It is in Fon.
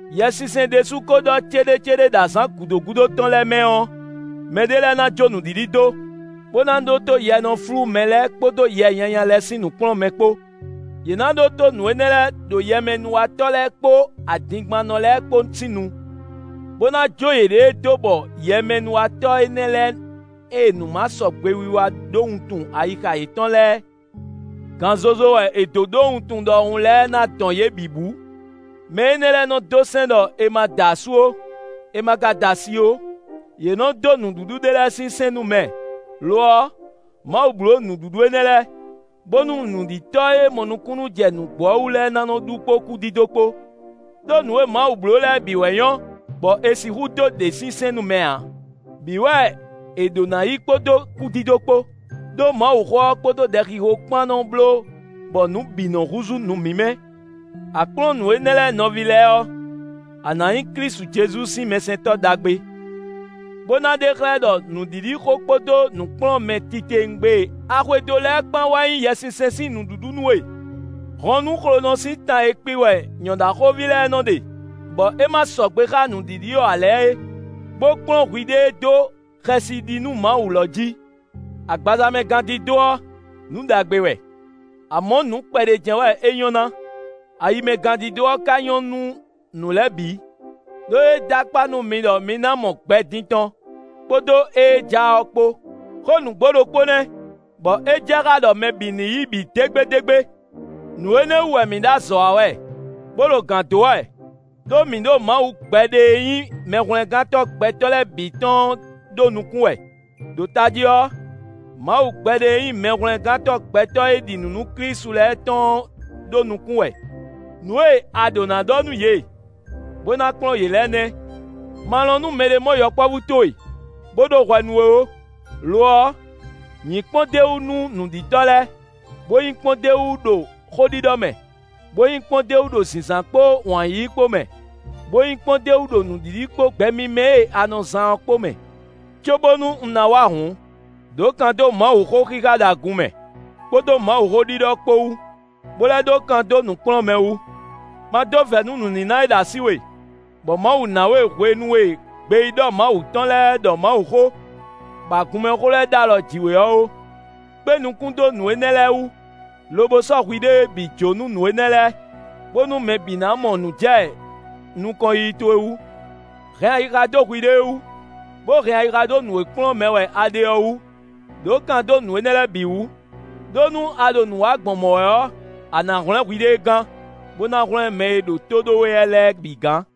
Yɛsinsɛn ɖésú ko ɖɔ céɖécéɖé ɖɔ azǎn gǔdo gúdo tɔn lɛ́ɛ mɛ ɔ́, mɛɖé lɛ́ɛ ná jó nǔɖiɖi dó, bó ná ɖótó yɛ e nɔ flú mɛ lɛ́ɛ kpódó yɛ nyanya lɛ́ɛ sín nǔkplɔ́nmɛ kpó. Yě ná ɖótó nǔ énɛ́ lɛ́ɛ ɖo yɛmɛnúwatɔ́ lɛ́ɛ kpó adingbannɔ lɛ́ɛ kpó sín nu, bó ná jó yěɖée dó bɔ yɛmɛnúwatɔ́ énɛ́ lɛ́ɛ e nǔmasɔgbewiwa ɖó wuntun ayixa yětɔn lɛ́ɛ gan zozo wɛ è dǒ ɖó wuntun ɖɔhun lɛ́ɛ ná dɔn yě bǐ bǔ. Mɛ énɛ́ lɛ́ɛ nɔ dó sɛ́n ɖɔ è ma da asú ó, è ma ka da asi ó. Yě nɔ dó nǔɖuɖu ɖé lɛ́ɛ sín sɛ́n nú mɛ; lo ɔ́, Mawu bló nǔɖuɖu énɛ́ lɛ́ɛ, bónú nǔɖitɔ́ e mɔ nukúnnú jɛ nǔgbó ɔ́ wú lɛ́ɛ ná nɔ ɖu kpó kúdídó kpó. Đó nǔ e Mawu bló lɛ́ɛ bǐ wɛ nyɔ́, bɔ è sixú dó ɖě sín sɛ́n nú mɛ ǎ; bǐ wɛ è ɖǒ ná yí kpódó kúdídó kpó. Đó Mawuxó ɔ́ kpódó ɖɛxixo kpán nɔ bló bɔ nǔ bǐ nɔ húzú nǔ mímɛ́. A kplɔ́n nǔ énɛ́ lɛ́ɛ nɔví lɛ́ɛ ɔ́, a nǎ nyí Klísu Jezu sín mɛsɛntɔ́ ɖagbe, bó ná ɖe xlɛ́ ɖɔ nǔɖiɖixó kpódó nǔkplɔ́nmɛ titewungbe e a xwedó lɛ́ɛ kpán wɛ nyí Yɛsinsɛn sín nǔɖuɖu nú we. Hɔn nú xlonɔ sín tan e kpi wɛ nyɔ̌ɖaxóví lɛ́ɛ nɔ ɖe, bɔ é ma sɔgbe xá nǔɖiɖi ɔ́ ǎ lɛ́ɛ é, bó kplɔ́n hwiɖée dó xɛsi ɖi nú Mawu lɔ jí. Agbaza mɛ gándídó ɔ́, nǔ ɖagbe wɛ; amɔ̌ nǔ kpɛɖé jɛ́n wɛ é nyɔ́ ná; ayi mɛ gándídó ɔ́ ka nyɔ́ nú nǔ lɛ́ɛ bǐ, ɖó é dó akpá nú mi ɖɔ mi ná mɔ gbɛ din tɔn, kpódó ée ja ɔ́ kpó. Xó nǔgbó ɖokpó nɛ́, bɔ é jɛ xá ɖɔ mɛ bǐ ní yí bǐ dégbédégbé. Nǔ énɛ́ wú wɛ mǐ ɖo azɔ̌ wa wɛ, bó ɖo gǎn dó wɛ, ɖó mǐ ɖo Mawu gbɛɖe e nyí Mɛhwlɛ́ngántɔ́ gbɛtɔ́ lɛ́ɛ bǐ tɔn ɔ́ ɖó nukún wɛ, ɖo tají ɔ́, Mawu gbɛɖe e nyí Mɛhwlɛ́ngántɔ́ gbɛtɔ́ e ɖi nǔ nú Klísu lɛ́ɛ tɔn ɔ́ ɖó nukún wɛ. Nǔ e a ɖǒ ná ɖɔ nú yě, bó ná kplɔ́n yě lɛ́ɛ nɛ́. Ma lɔn nú mɛɖé mɔ yɔkpɔ́vú towe, bó ɖó hwɛ nú we ó. Lo ɔ́, nyǐ kpɔ́ndéwú nú nǔɖitɔ́ lɛ́ɛ, bó nyí kpɔ́ndéwú ɖo xóɖiɖɔ mɛ, bó nyí kpɔ́ndéwú ɖo zǐnzán kpó wǎn yíyí kpó mɛ, bó nyí kpɔ́ndéwú ɖo nǔɖiɖi kpó gbɛ mímɛ́ e a nɔ zán ɔ́ kpó mɛ. Cóbónú un ná wá hǔn, ɖǒ kan dó Mawuxó xixa ɖo agun mɛ, kpódó Mawuxó ɖiɖɔ kpó wú, bó lɛ́ ɖó kan dó nǔkplɔ́nmɛ wú. Ma dó vɛ̌ nú nǔníná e ɖo así we, bɔ Mawu ná we hwenu e gbeyíɖɔ Mawu tɔn lɛ́ɛ ɖɔ Mawuxó, bɔ agunmɛxó lɛ́ɛ ɖ'alɔ jí we ɔ́ ó. Kpé nukún dó nǔ énɛ́ lɛ́ɛ wú, lobo sɔ́ hwiɖée bǐ jó nú nǔ énɛ́ lɛ́ɛ, bónú mɛ bǐ ná mɔ nǔ jɛ nukɔn yiyi towe wú. Hɛn ayixa dó hwiɖée wú, bó hɛn ayixa dó nǔ e kplɔ́n mɛ wɛ a ɖe ɔ́ wú. Đǒ kan dó nǔ énɛ́ lɛ́ɛ bǐ wú; ɖó nú a ɖo nǔ wa gbɔn mɔ̌ wɛ ɔ́, a nǎ hwlɛ́n hwiɖée gán, bó ná hwlɛ́n mɛ e ɖo tó ɖó we wɛ lɛ́ɛ bǐ gán.